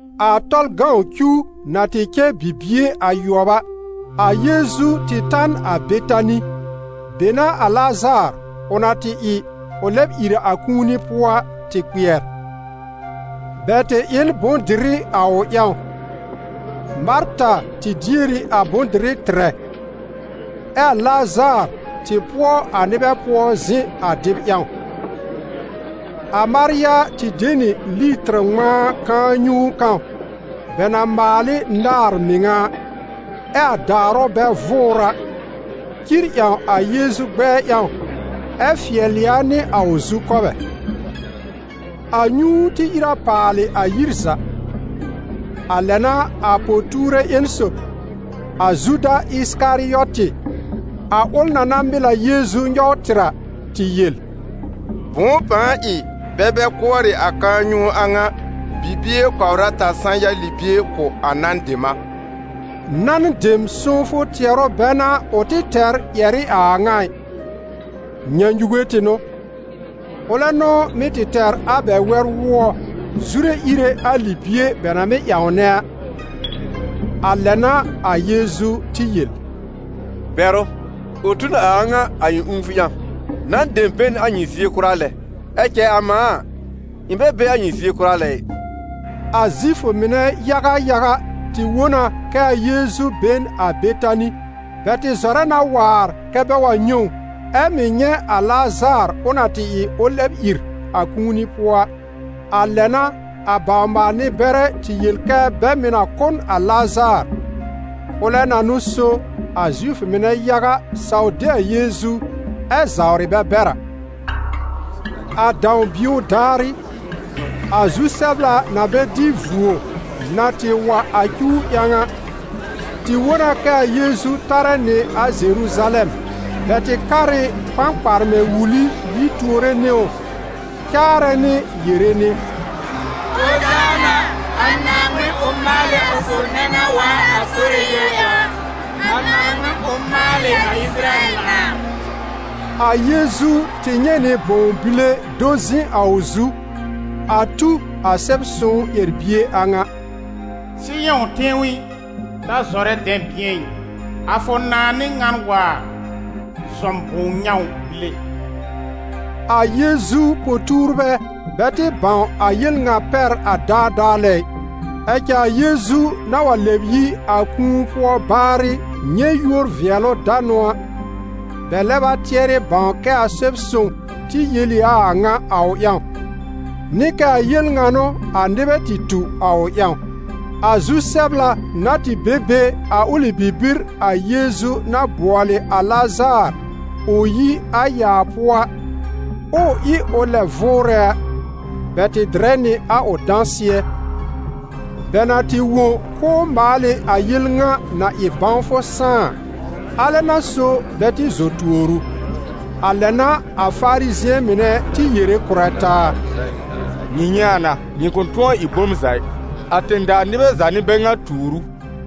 A Tɔlʋ cuw na tɩ cɛ bibie ayʋɔb a, a Yeezu tɩ ta n a Betani. Be n'a a Lazaar, ʋ na tɩ ɩ ʋ lɛb ìr a kũuni pʋɔ a, tɩ kpɩɛr. Bɛ tɩ ɩ n bʋ̃-dɩrɩ a ʋ ƴãw: Marta tɩ dier ɩ a bʋ̃-dɩrɛ tɩrɛ, ɛ a Lazaar tɩ pʋɔ a nɩbɛ pʋɔ zɩ̃ a dɩb ƴãw. A Marya tɩ de nɩ litɩr ŋmãa kãa-nyũu kãw bɛ na maal ɩ náàr mɩŋa a, ɛ a daarʋ bɛ vʋʋr a, cir ƴãw a Yeezu gbɛɛ ƴãw ɛ fɩɛlɩ a nɩ a ʋ zukɔbɛ. A nyũu tɩ ìr a paalɩ a yir za. A lɛ n'a a po-tuurbɛ ƴẽn sob, a Zuda Ɩsɩkarɩɔtɩ, a ʋl na na mɩl a Yeezu nyɔw tɩr a, tɩ yel: «Bʋ̃ʋ pãa ɩ bɛ bɛ kʋɔrɩ a kãa-nyũu a ŋa, bibie kɔbr ata sã-ya libie kʋ̀ a nan dem a!» Nan dem sõwfʋ tɩɛrʋ bɛ n'a ʋ tɩ tɛr ƴɛr ɩ a a ŋa ɩ. Nyãnyuge tɩ n'ʋ. Ʋlɛ n'ʋ mɩ́ tɩ tɛr a bɛ wɛr-wʋɔ zure íre a libie bɛ na mɩ́ ƴãwnɛ a. A lɛ n'a a Yeezu tɩ yel: «Bɛr ʋ! Ʋ tu n a a ŋa a ɩ̃ ũufʋ ƴãw. Nan dem be n a nyɩ zie kʋra lɛ, ɛ cɛ a mãa a, ɩ̃ bɛ be a nyɩ zie kʋra lɛ ɩ.» A Zifʋ mɩnɛ yaga yaga tɩ wõ na kɛ a Yeezu be n a Betani. Bɛ tɩ zɔrɛ na waar kɛ́ bɛ wa nyɛ̃ ʋ, ɛ mɩ̀ nyɛ̃ a Lazaar ʋ na tɩ ɩ ʋ lɛb ìr a kũuni pʋɔ a. A lɛ n'a a bawr-maal-nɩ-bɛrɛ tɩ yel kɛ bɛ mɩ̀ na kʋ́ n a Lazaar, ʋlɛ na n'ʋ so a Zifʋ mɩnɛ yaga saw de a Yeezu ɛ zawrɩ bɛ bɛr a. A dãw-bio daarɩ, a zu-sɛbla na bɛ dɩ vuo na tɩ wa a cuw ƴãw a, tɩ wõ na kɛ a Yeezu tarɛ nɩ a Zeruzalɛm. Bɛ tɩ kar ɩ kpãkparmɛ̃ wuli yi tuore nɩ ʋ, caarɛ nɩ yere nɩ: «Ozaana! A Naaŋmɩn, ʋ maalɩ a sob nɛ na waar a Sore yúor ƴãw a! A Naaŋmɩn, ʋ maalɩ a Ɩsɩrayɛl nãà!» A Yeezu tɩ nyɛ̃ nɩ bõw bile do zɩ̃ a ʋ zu, a tu a Sɛb-sõw ƴɛr-bie a ŋa: « Sɩyɔ̃ tẽw i, ta zɔrɛ dɛ̃bɩ̃ɛ ɩ. A fʋ nãà n'ɩ ŋan waar, zɔm bõw-nyãw bile!» A Yeezu po-tuurbɛ bɛ tɩ bãw a yel ŋa pɛr a daadaa lɛ ɩ. Ɛ cɛ a Yeezu na wa lɛb yi a kũu pʋɔ baarɩ nyɛ̃ yúor-vɩɛlʋ-danʋ a, bɛ lɛb a tɩɛrɩ bãw kɛ a Sɛb-sõw tɩ yel ɩ a a ŋa a ʋ ƴãw, nɩ kɛ a yel ŋa n'ʋ a nɩbɛ tɩ tu a ʋ ƴãw. A zu-sɛbla na tɩ be be a ʋlɩ bibir a Yeezu na bʋɔlɩ a Lazaar ʋ yi a yaa pʋɔ a, ɛ ʋ ɩ ʋ lɛb vʋʋrɛ a, bɛ tɩ dɩrɛ nɩ a ʋ dãsɩɛ. Bɛ na tɩ wõ k'ʋʋ maal ɩ a yel ŋa na ɩ bãwfʋ sãá a, alɛ n'a so bɛ tɩ zɔ tuor ʋ. A lɛ n'a a Farizɩ̃ɛ mɩnɛ tɩ yere kʋ̀rɛ taa: «Nyɩ nyɛ̃ a na: nyɩ kʋ̃ tʋ̃ɔ ɩ bom za ɩ: a tẽ-daa nɩbɛ za n'ɩ bɛ ŋa tuur ʋ!»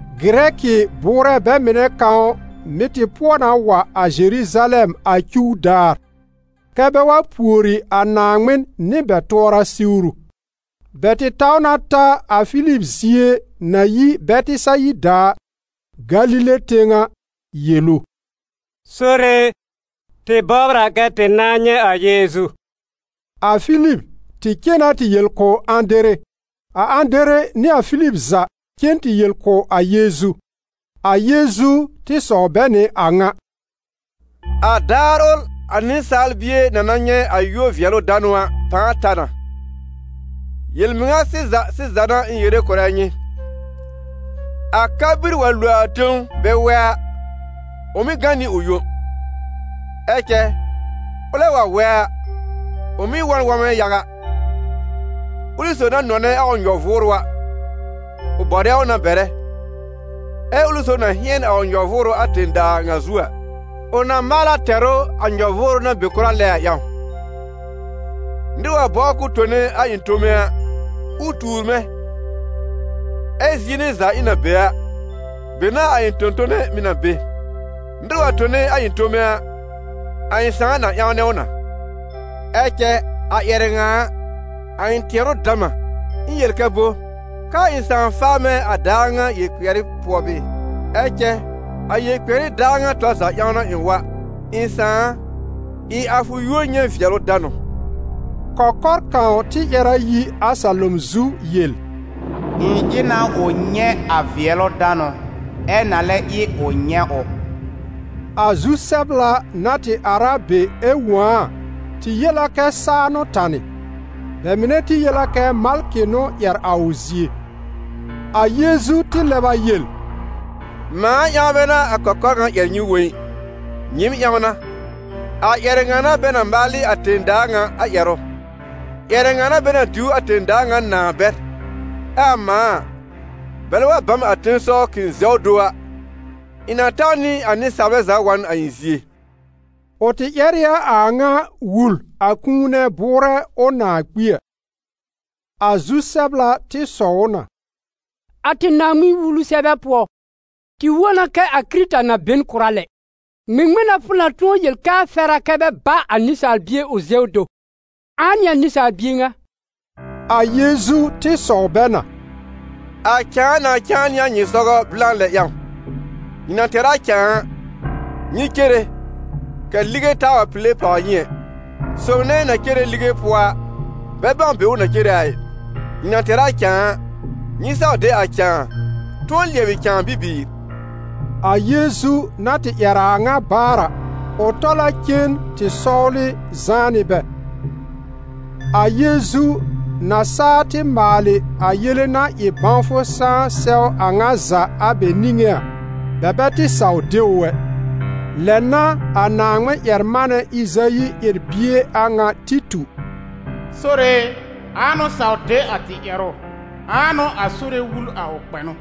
Gɩrɛkɩ bʋʋrɛ bɛ mɩnɛ kãw mɩ̀ tɩ pʋɔ na wa a Zeruzalɛm a cuw daar, kɛ́ bɛ wa pùori a Naaŋmɩn nɩ bɛ tʋɔra siwru. Bɛ tɩ taw na ta a Filib zie na yi Bɛtɩsayida a, Galile tẽw a, yel ʋ: «Sore e, tɩ bɔbr a kɛ tɩ nãá nyɛ̃ a Yeezu.» A Filib tɩ cen na tɩ yel kʋ̀ Ãdere, a Ãdere nɩ a Filib za cen tɩ yel kʋ̀ a Yeezu. A Yeezu tɩ sɔw bɛ nɩ a ŋa: «A daar ʋl a Nɩsaal Bie na na nyɛ̃ a yúor-vɩɛlʋ-danʋ a pãa ta na. Yel-mɩŋa sɩza sɩza n'a ɩ̃ yere kʋ̀rɛ nyɩ: a ka-bir wa lo a tẽw bɛ wɛ a, ʋ mɩ́ gã nɩ ʋ yõ. Ɛ cɛ ʋlɛ wa wɛ a, ʋ mɩ́ wɔ̃ n wɔ̃mɛ yaga. Ʋlɩ sob na nɔnɛ a ʋ nyɔ-vʋʋrʋ a, ʋ bɔrɛ ʋ na bɛrɛ, ɛ ʋlɩ sob na hɩ̃ɛn a ʋ nyɔ-vʋʋrʋ a tẽ-daa ŋa zu a, ʋ na maal a tɛr ʋ a nyɔ-vʋʋrʋ na be kʋra lɛ a ƴãw. Nɩr wa bɔbr k'ʋʋ tone a ɩ̃ tome a, ʋ tuur mɛ̃; ɛ zie nɛ za ɩ̃ na be a, be n'a a ɩ̃ tõ-tone mɩ̀ na be. Nɩr wa tone a ɩ̃ tome a, a ɩ̃ Sãà na ƴãwnɛ ʋ na.» «Ɛ cɛ a ƴɛrɛ ŋa a, a ɩ̃ tɩɛrʋ dam a. Ɩ̃ yel kɛ bo? Kɛ́ a ɩ̃ Sãà faa mɛ̃ a daar ŋa yel-kpɩɛrɩ pʋɔ bɩɩ? Ɛ cɛ a yel-kpɩɛrɩ daar ŋa tɔr za ƴãw n'a ɩ̃ wa. Ɩ̃ Sãà a, ɩ a fʋ yúor nyɛ̃ vɩɛlʋ danʋ.» Kɔkɔr kãw tɩ ƴɛr a yi a salom zu yel: «Ɩ̃ ɩ na ʋ nyɛ̃ a vɩɛlʋ danʋ, ɛ na lɛ ɩ ʋ nyɛ̃ ʋ.» A zu-sɛbla na tɩ ar a be ɛ wõ a a, tɩ yel a kɛ saa n'ʋ tanɩ. Bɛ mɩnɛ tɩ yel a kɛ malkɩ n'ʋ ƴɛr a ʋ zie. A Yeezu tɩ lɛb a yel: «Mãa ƴãw bɛ n'a a kɔkɔr ŋa ƴɛr nyɩ wõ ɩ, nyɩɩm ƴãw n'a. A ƴɛrɛ ŋa n'a bɛ na maal ɩ a tẽ-daa ŋa a ƴɛrʋ; ƴɛrɛ ŋa n'a bɛ na diw a tẽ-daa ŋa nãà bɛr. Ɛ a mãa a, bɛlɛ wa ba m a tẽsɔw k'ɩ̃ zɛw do a, ɩ̃ na taw nɩ a nɩsaalbɛ za wa n a ɩ̃ zie.» Ʋ tɩ ƴɛr ɩ a a ŋa wul a kũu nɛ bʋʋrɛ ʋ nãà kpi a. A zu-sɛbla tɩ sɔw ʋ na: «A tɩ Naaŋmɩn-Wulu sɛbɛ pʋɔ, tɩ wõ na kɛ a Kɩrɩta na be n kʋra lɛ. Ŋmɩŋmɩn n'a fʋ na tʋ̃ɔ yel kɛ a fɛr a bɛ ba a Nɩsaal Bie ʋ zɛw do? Ãa n'ɩ a Nɩsaal Bie ŋa?» A Yeezu tɩ sɔw bɛ na: «A cãa na cãa nɩ a nyɩ sɔgɔ blã lɛ ƴãw. Nyɩ na tɛr a cãa a, nyɩ cere, kɛ̀ lige taa pile pàwr nyɩ ɛ; sob nɛ na cere lige pʋɔ a bɛ bãw be ʋ na cere a ɩ. Nyɩ na tɛr a cãa a, nyɩ saw de a cãa, tʋ̃ɔ lɩɛbɩ cãa bibiir.» A Yeezu na tɩ ƴɛr a a ŋa baar a, ʋ tɔl a cen tɩ sɔwlɩ zãá nɩ bɛ. A Yeezu na saa tɩ maalɩ a yele-na-ɩ-bãwfʋ-sãá sɛw a ŋa za a bɛ niŋé a, bɛ bɛ tɩ saw de ʋ ɛ. Lɛ n'a a Naaŋmɩn-ƴɛr-manɛ Ɩzayi ƴɛr-bie a ŋa tɩ tu: «Sore e, ãa n'ʋ saw de a tɩ ƴɛrʋ? Ãa n'ʋ a Sore wul a ʋ kpɛnʋ?»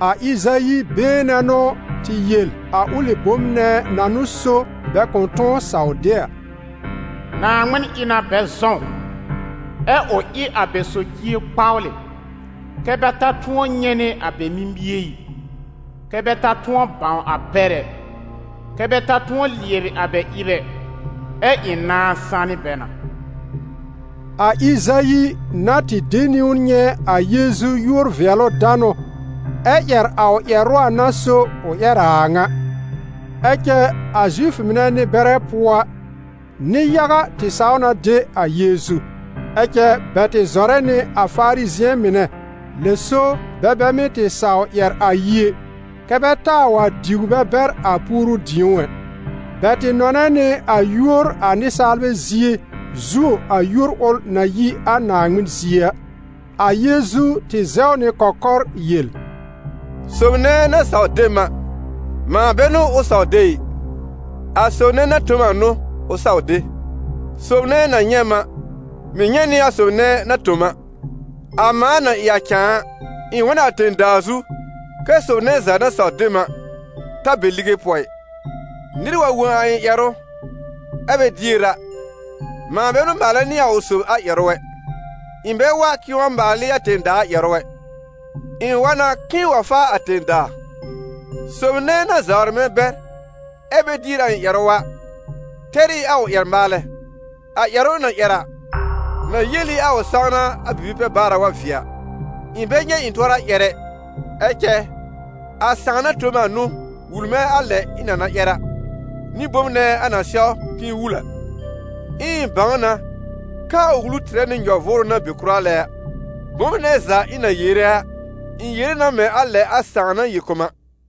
A Ɩzayi been nɛ n'ʋ tɩ yel a ʋlɩ bom nɛ na n'ʋ so bɛ kʋ̃ tʋ̃ɔ saw de a. «Naaŋmɩn ɩ na bɛ zɔ̃w, ɛ ʋ ɩ a bɛ socie kpawlɩ, kɛ́ bɛ ta tʋ̃ɔ nyɛ̃ nɩ a bɛ mimie ɩ, kɛ́ bɛ ta tʋ̃ɔ bãw a pɛr ɛ, kɛ́ bɛ ta tʋ̃ɔ lɩɛbɩ a bɛ ɩb ɛ, ɛ ɩ̃ nãá sanɩ bɛ na.» A Ɩzayi na tɩ de niwn nyɛ̃ a Yeezu yúor-vɩɛlʋ-danʋ, ɛ ƴɛr a ʋ ƴɛrʋ a n'a so ʋ ƴɛr a a ŋa. Ɛ cɛ a Zifʋ mɩnɛ nɩ-bɛrɛ pʋɔ a, nɩ-yaga tɩ saw na de a Yeezu. Ɛ cɛ bɛ tɩ zɔrɛ nɩ a Farizɩ̃ɛ mɩnɛ, lɛ so bɛ bɛ mɩ́ tɩ saw ƴɛr a yi ɛ, kɛ́ bɛ taa wa diw bɛ bɛr a puoru-dĩ̀ó ɛ. Bɛ tɩ nɔnɛ nɩ a yúor a nɩsaalbɛ zie zuo a yúor ʋl na yi a Naaŋmɩn zie a. A Yeezu tɩ zɛw nɩ kɔkɔr yel: «Sob nɛ na saw de m a, mãa bɛ n'ʋ ʋ saw de ɩ, a sob nɛ na tõ m a n'ʋ ʋ saw de. Sob nɛ na nyɛ̃ m a, mɩ̀ nyɛ̃ nɩ a sob nɛ na tõ m a. A mãa na ɩ a cãa a, ɩ̃ wa n a tẽ-daa zu kɛ sob nɛ za na saw de m a, ta be lige pʋɔ ɩ. Nɩr wa wõ a ɩ̃ ƴɛrʋ ɛ bɛ dier a, mãa bɛ n'ʋ maalɛ nɩ a ʋ sob a ƴɛrʋ ɛ: ɩ̃ bɛ wa k'ɩ̃ɩ wa maal ɩ a tẽ-daa ƴɛrʋ ɛ, ɩ̃ wa na k'ɩ̃ɩ wa faa a tẽ-daa. Sob nɛ na zawrɩ mɛ̃ bɛr ɛ bɛ dier a ɩ̃ ƴɛrʋ a, tɛr ɩ a ʋ ƴɛr-maalɛ: a ƴɛrʋ ɩ̃ na ƴɛr a, na yel ɩ a ʋ sãwna a bibi-pɛ-baara wa vɩɛ a. Ɩ̃ bɛ nyɛ̃ ɩ̃ tʋɔra ƴɛr ɛ, ɛ cɛ a Sãà na tõ m a n'ʋ wul mɛ̃ a lɛ ɩ̃ na na ƴɛr a, nɩ bom nɛ a na sɛw k'ɩ̃ɩ wul a. Ɛ ɩ̃ bãw na kɛ a ʋ wulu tɩrɛ nɩ nyɔ-vʋʋrʋ na be kʋra lɛ a: bom nɛ za ɩ̃ na yere a, ɩ̃ yere na mɛ̃ a lɛ a Sãà na yel kʋ̀ m a.»